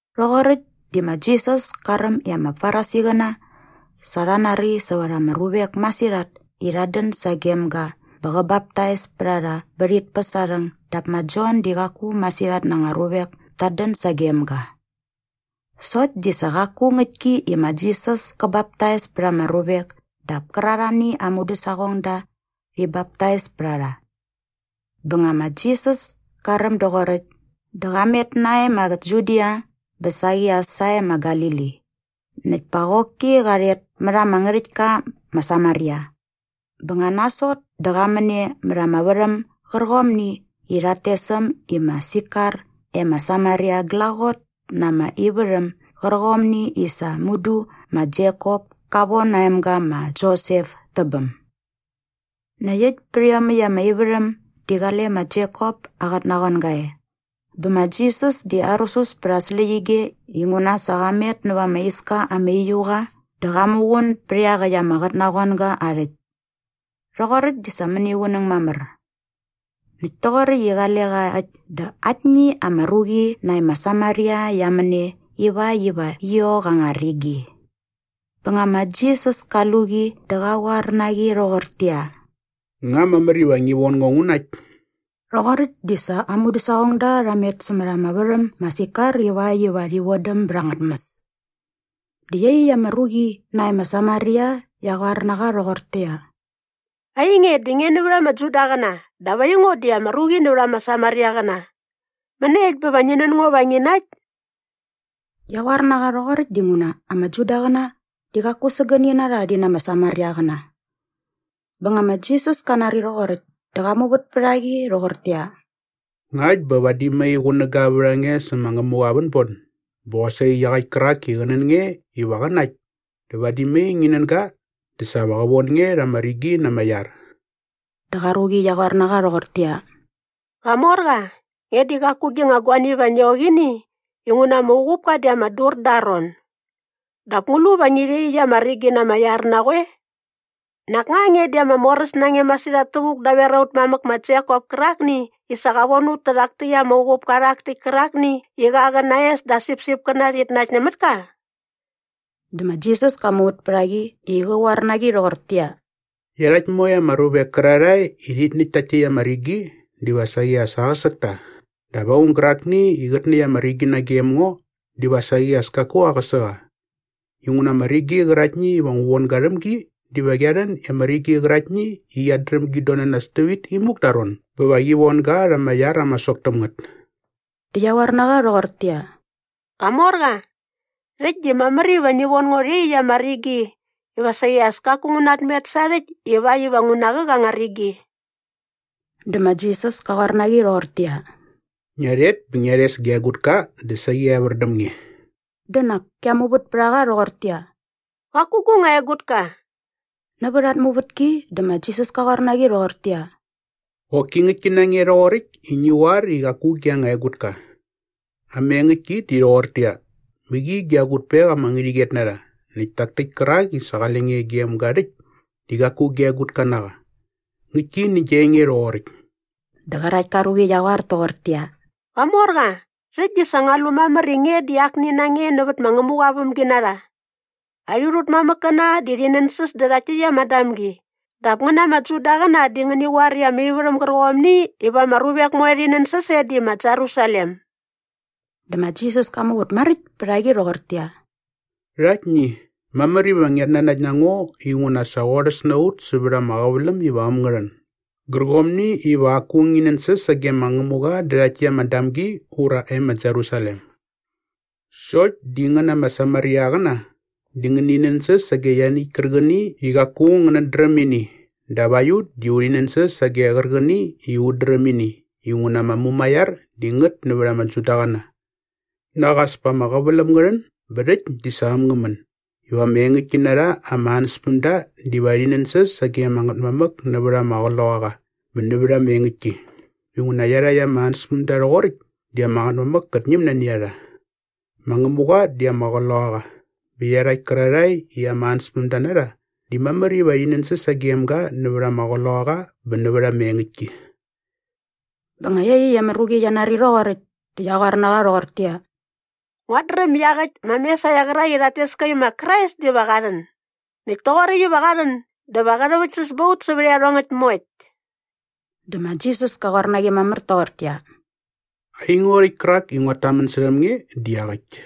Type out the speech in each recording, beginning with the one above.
Rhoqoräkt di ma Jisas ka räm i ama Farisiqäna sa rha nari sävät ama ruvek masirhat i rhat dän sagem ga bä qä baptais pät a rha bä rhit päs aa rhäng dap ma Jon di qaku masirhat na anga ruvek tat dän sagem ga. Sokt di sa qaku ngäktki i ma Jisas kä baptais pät ama ruvek dap kärarhani aa mudäsaqongda rhi baptais pät a rha. Bä nga ma Jisas ka räm doqoräkt dä qa met nae ma Judia bä saqi as sae ma Galili. Näkt pa qoki qa rhet mät ama ngärhäktka ma Samaria. Bä nga nasot dä qa män e mät ama värhäm gärqomni i rhat tes äm i ma Sikar e ma Samaria glaqot na ama ivärhäm gärqomni i sa mudu ma Jekop ka von aa emga ma Josep tä bäm. Näkt äkt pät iomäkt ama ivärhäm di qale ma Jekop aa qotnaqoanga e. Bä ma Jisas di arusus pät aa släqyige inguna sa qa met näva ama iska ama uiu qa dä qa muqun bät iaqäkt ama qotnaqoanga aa rhäkt. Rhoqoräkt di sa mäniqunäng mamär. Näkt toqoräkt i qale qa äkt dä aktni ama ruqi nae ma Samaria qia män e ivakt iva qi ok anga rigi. Bä nga ma Jisas ka lu qi dä qa qoar na qi rhoqortäqyia, “Nga mamär iva ngi von ngo ngu nakt?” Rhoqoräkt di sa aa mudäsaqongda rha met sämät ama värhäm ma Sikar ivakt iva rhi vodäm bät anga tmäs. Dä iaqyäkt ama ruqi nae ma Samaria qia qoar na qa rhoqortäqyia, “Ainge di nge nävät ama Judaqäna dap aingo di ama ruqi nävät ama Samariaqäna. Mäniekt bä va ngi nän ngo va ngi nakt?” Qia qoar na qa rhoqoräkt dinguna ama Judaqäna di qaku sägäni na rha rhi na ama Samariaqäna. Bä nga ma Jisas ka nari rhoqoräkt dä qa muvät pät a qi rhoqortäqyia, “Ngakt bä vadi mai qunäga vät a nge sä ma Ngämuqa aa vänbon bä qosaqi iaqäkt kärak i qä nän nge iva qä nakt dä vadi mai ngi nän ga dä sa va qä von nge rha ama rigi na ama iar.” Dä qa ruqi qia qoar na qa rhoqortäqyia, “Qamorqa, nge di qaku gi nga guani iva ngi ok nä ini inguna ma uqupka di ama dur da aa ron. Dap ngu lu va ngi rha iaqyäkt ama rigi na ama iar na qoe? Nak nga nge di ama moräs na nge masirhat tävuk daver aut mamäk ma Jekop kärakni i sa qa von ut tärhak täkt ama uqupka rhak täkt kärakni i qa qä na aa es dä aa sipsipkäna rhit nakt nämät ka?” Dä ma Jisas ka muvät pät a qi i qä qoar na qi rhoqortäqyia, “Iarhakt moe ama ruvek kärarhae i rhit näkt takt täkt ama rigi diva saqi as aqäsäk ta dap aung gärakni i qät näkt ama rigi nagem ngo diva saqi as kaku aqäsä qa. Inguna ama rigi qäraktni iva ngu von ga rhäm gi diva qia rhän i ama rigi qäraktni i qiat dräm git don na nas tävit imuk da aa ron bä va qi von ga rha ama iar ama sok täm ngät.” Dä qia qoar na qa rhoqortäqyia, “Qamorqa, rhäkt di mamär iva ngi von ngo rhä iaqyäkt ama rigi iva saqi as kaku ngu natmet sarhäkt ivakt iva ngu naqäk anga rigi.” Dä ma Jisas ka qoar na qi rhoqortäqyia, “Ngia rhet bä ngia rhes gia egutka dä saqi evär däm nge.” Dä nak kia muvät pät a qa rhoqortäqyia, “Qaku gu nga egutka.” Nävät at muvätki dä ma Jisas ka qoar na qi rhoqortäqyia, “Qoki ngäktki na nge rhoqoräkt i ngi qoar i qaku gi nga egutka. Ama engäktki di rhoqortäqyia, mäqi gia egutpek ama ngärhäqyet na rha näkt tak täkt kärak i sa qale qa gem nge rhäkt di qaku gia egutka na qa. Ngäktki nä gia enge rhoqoräkt.” Dä qärakt ka ruqi qia qoar toqortäqyia, “Qamorqa, rhäkt di sa ngua lu mamär i nge di nak akni na nge nävät ma Ngämuqa aa vämginarha. Aiut ut mamäkkäna di rhi nänsäs dä rhakt täkt ama damgi dap ngän ama Judaqäna di ngäni qoar i ama ivärhäm gärqomni iva ama ruvek moe rhi nänsäs e di ma Jerusalem.” Dä ma Jisas ka muvät maräkt pät a qi rhoqortäqyia, “Rhaktni, mamär iva ngiat nanakt na ngo inguna sa qorhäs na ut sävät ama qäväläm iva äm ngä rhän gärqomni iva qaku ngi nänsäs sage ama Ngätmamäk dä rhakt täkt ama damgi ura e ma Jerusalem. Sokt di ngän ama Samariaqäna di ngäni nänsäs sage ianiäkt kärqäni i qaku ngänät dräm ini dap aiut di urhi nänsäs sage qärqäni i ut dräm ini inguna ama mumaiar di ngät nävät ama Judaqäna. Nak as pa ama qäväläm ngä rhän bä rhäkt di sa äm ngä män iva ama engäktki na rha ama ansäspämda diva rhi nänsäs sage ama Ngätmamäk nävät ama qloqaqa bä nävät ama engäktki inguna iarhakt ama ansäspämda rhoqoräkt di ama Ngätmamäk kät ñäm nani a rha. Ma Ngämuqa di ama qloqaqa bä iarhakt kärarhae i aa ansäspämda na rha di mamär iva rhi nänsäs sagem ga nävät ama qloqaqa bä nävät ama engäktki.” Bä nga iaqyäkt ama ruqi qia nari rhoqoräkt dä qia qoar na qa rhoqortäqyia, “Nguat dräm i iaqäkt ma Mesaia qärak i rhat tes ka i ma Krais diva qa rhän. Näkt toqoräkt iva qa rhän dä va qä rhäväktsäs ba ut sävät iarhongäkt moekt.” Dä ma Jisas ka qoar na qi mamär toqortäqyia, “Aingo rhäkt kärak i nguat tamän särhäm nge di iaqäkt.”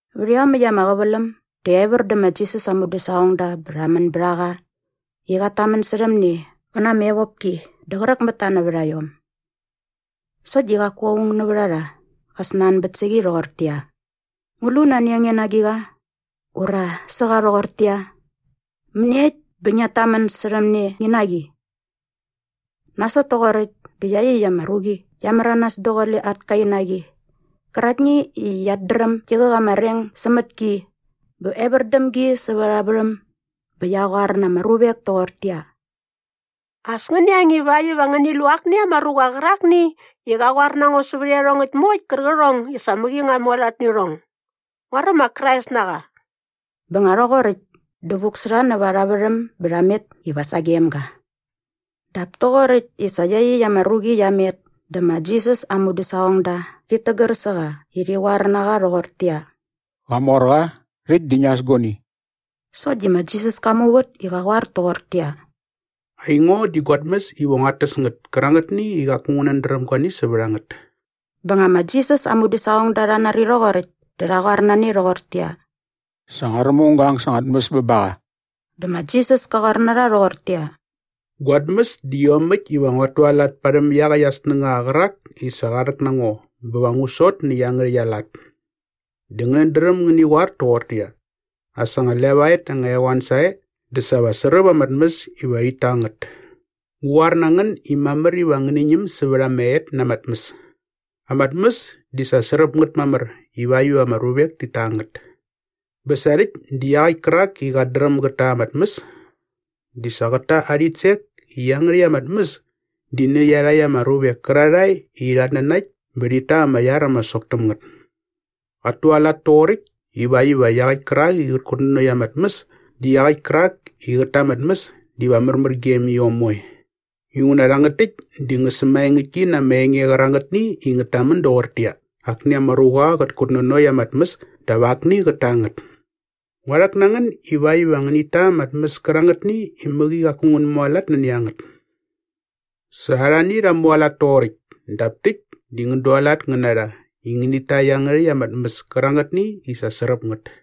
Vät iomäkt ama qäväläm dä evär dä ma Jisas aa mudäsaqongda bä rha män bät a qa i qat tamän särhäm ne qä na ama evopki dä qräk mät ta nävät a iom. Sokt di qaku aung nävät a rha qa snanbät sä qi rhoqortäqyia, “Ngu lu nani a nge na agiqa?” ura sä qa rhoqortäqyia, “Mäniekt bä ngiat tamän särhäm ne ngi na qi?” Nasot toqoräkt dä iaqyäkt ama ruqi qia märanas daqule at kainaqi qäraktni i qiat dräm gi qäk ama reng sämät ki bä evär däm gi sävät arha värhäm bä qia qoar na ama ruvek toqortäqyia, “As ngäni ang ivakt iva ngäni lu akni ama ruqa qärakni i qa qoar na ngo sävät iarhongäkt moekt kärqärhong i sa mäqi ngua mualat nä irhong. Nguaräm ma Krais na qa.” Bä nga rhoqoräkt dä vuk sä rha näva arha värhäm bä rha met iva sagem ga. Dap toqoräkt i sa iaqyäkt ama ruqi qia met dä ma Jisas aa mudäsaqongda rhit tägär sä qa i rhi qoar na qa rhoqortäqyia, “Qamorqa, rhäkt di ngia äs guani.” Sokt di ma Jisas ka muvät i qa qoar toqortäqyia, “Aingo di gua tmäs iva nguat täs ngät kärangätni i qaku ngänät dräm guani sävät a ngät.” Bä nga ma Jisas aa mudäsaqongda rha nari rhoqoräkt dä rha qoar na ne rhoqortäqyia, “Sa nguaräm aung ga ang sa anga tmäs bä ba qa.” Dä ma Jisas ka qoar na rha rhoqortäqyia, “Gua tmäs di iomäkt iva nguat tualat parhäm iaqäkt aa snängaqa qärak i sa qa rhäk na ngo bä va ngu sot nä iangärhäkt aa lat. Dä ngänät dräm ngäni qoar toqortäqyia. ‘As anga levaet anga eqoan sae dä sa va sräp ama tmäs iva rhit ta ngät.’ Ngu qoar na ngän i mamär iva ngäni ñäm sävät ama et na ama tmäs! Ama tmäs di sa sräp ngät mamär ivakt iva ama ruvek ti ta ngät. “Bä sa rhäkt di iaqäkt kärak i qat dräm gät ta ama tmäs di sa qät ta aa rhitsek i iangärhäkt ama tmäs di nä iarhakt ama ruvek kärarhae i rhat nanakt bä rhit ta ama iar ama sok täm ngät. Qat tualat toqoräkt ivakt iva iaqäkt kärak i qät kutnanokt ama tmäs dä iaqäkt kärak i qät ta ama tmäs diva märmär gem iom moe. Inguna rhangät täkt di ngä sämaengäktki na ama enge qärangätni i ngät tamän doqortäqyia, ‘Akni ama ruqa qät kutnanokt ama tmäs dap pa akni qät ta ngät.’ Ngua rhäk na ngän ivakt iva ngänit ta ama tmäs kärangätni i mäqi qaku ngän mualat nani a ngät. Sa arhani rha mualat toqoräkt dap täkt di ngän dualat ngän na rha i ngänit ta iangärhäkt ama tmäs kärangätni i sa sräp ngät.”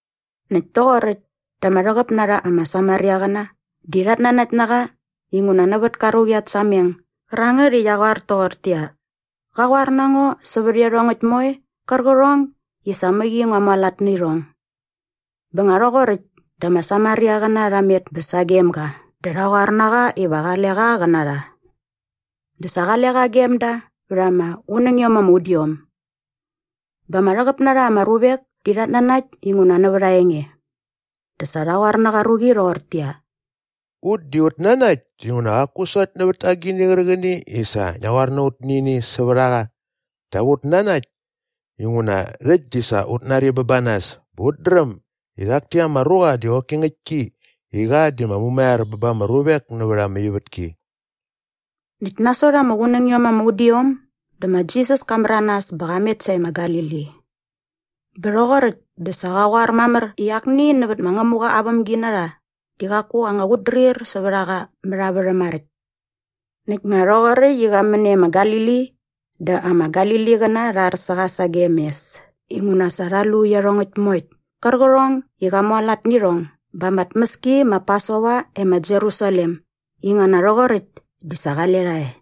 Näkt toqoräkt dä ama rhäqäp na rha ama Samariaqäna di rhat nanakt na qa inguna nävät ka ruqi at sameng gärangät i qia qoar toqortäqyia, “Qa qoar na ngo sävät iarhongäkt moe qärqärhong i sa mäqi ngua mualat nä irhong.” Bä nga rhoqoräkt dä ama Samariaqäna rha met bä sagem ga dä rha qoar na qa iva qale qa qä na rha. Dä sa qale qa gem da vät ama qunängiom ama udiom. Bä ama rhäqäp na rha ama ruvek di rhat nanakt inguna nävät aa enge. Dä sa rha qoar nä qa ruqi rhoqortäqyia, “Ut di ut nanakt dinguna qaku sokt nävät agini qärqäni i sa ngia qoar na ut nä ini sävät a qa dap ut nanakt inguna rhäkt di sa ut nari bä ba nas bä ut dräm i rhak täkt ama ruqa di qoki ngäktki i qa di ma Mumaiar bä ba ama ruvek nävät ama ivätki.” Näkt nasot ama qunängiom ama udiom dä ma Jisas ka märanas bä qa met sae ma Galili. Bä rhoqoräkt dä sa qa qoar mamär i akni nävät ma Ngämuqa aa vämginarha di qaku anga qutdrir sävät a qa mät aa värhäm maräkt. Näkt nga rhoqoräkt i qa män e ma Galili dä ama Galiliqäna rha ar sä qa sagem mes inguna sa rha lu iarhongäkt moekt kärqärhong i qa mualat nä irhong ba ama tmäski ma Pasova e ma Jerusalem inguna rhoqoräkt di sa qale rha e.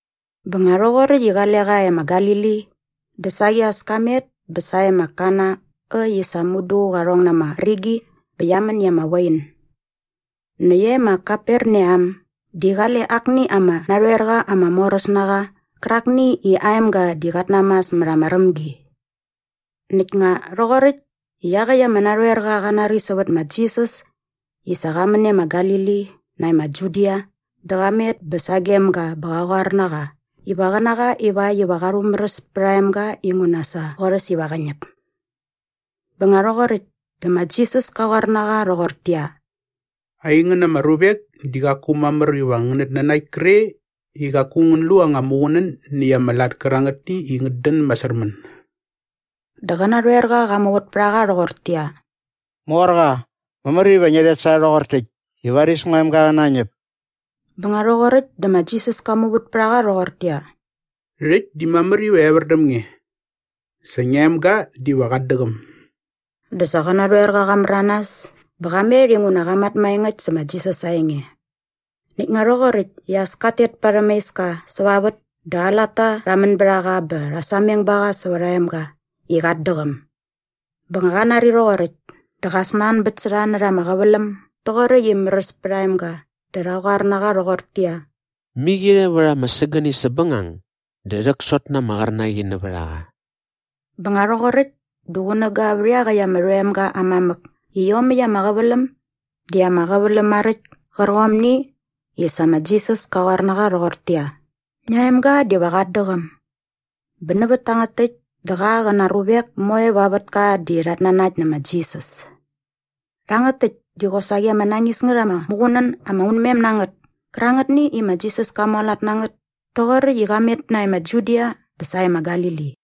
Bä nga rhoqoräkt i qale qa e ma Galili dä saqi as ka met bä sae ma Kana äkt i sa mudu qa rhong na ama rigi bä qia män i ama wain. Näkt e ma Kaperneam di qale akni ama narhoerqa ama moräs na qa qärakni i aa emga di qat namas mät ama rämgi. Näkt nga rhoqoräkt i iaqäkt ama narhoerqa qa nari sävät ma Jisas i sa qa män e ma Galili nae ma Judia dä qa met bä sagem ga bä qa qoar na qa iva qä na qa ivakt iva qa rhumäräs pät aa emga inguna sa qorhäs iva qä ñäp. Bä nga rhoqoräkt dä ma Jisas ka qoar na qa rhoqortäqyia, “Aingän ama ruvek di qaku mamär iva ngänät nanakt kre i qaku ngän lu anga muqunän näkt ama lat kärangätni i ngät dän masärmän.” Dä qä narhoerqa qa muvät pät a qa rhoqortäqyia, “Morqa, mamär iva ngia rhet sae rhoqor täkt i varis ngua emga qä nañäp.” Bä nga rhoqoräkt dä ma Jisas ka muvät pät a qa rhoqortäqyia, “Rhäkt di mamär iva evär däm nge. Sa ngia emga diva qat däqäm.” Dä sa qä narhoerqa qa märanas bä qa met inguna qa mat maengäkt sä ma Jisas aa enge. Näkt nga rhoqoräkt i as kat tet parhäm aa iska säva vät dä aa latta rha män bät a qa bä rha sameng ba qa sävät aa emga i qat däqäm. Bä nga qa nari rhoqoräkt dä qa snanbät sä rha närha ama qäväläm doqoräkt i märäs pät aa emga dä rha qoar na qa rhoqortäqyia, “Mäqirhe vät ama sägäni säpbängang dä rhäksot na ama qärnaqi nävät a qa.” Bä nga rhoqoräkt dä qunäga vät iaqäkt ama rhoemga aa mamäk i iomäkt ama qäväläm di ama qäväläm maräkt kärqomni i sa ma Jisas ka qoar na qa rhoqortäqyia, “Ngia emga diva qat däqäm.” Bä nävät tangät täkt dä qa qä na aa ruvek moe va aa vätka di rhat nanakt nä ma Jisas. Rhangät täkt di qosaqi ama nañis ngät ama muqunän ama unmem na ngät kärangätni i ma Jisas ka mualat na ngät toqoräkt i qa met nae ma Judia bä sae ma Galili.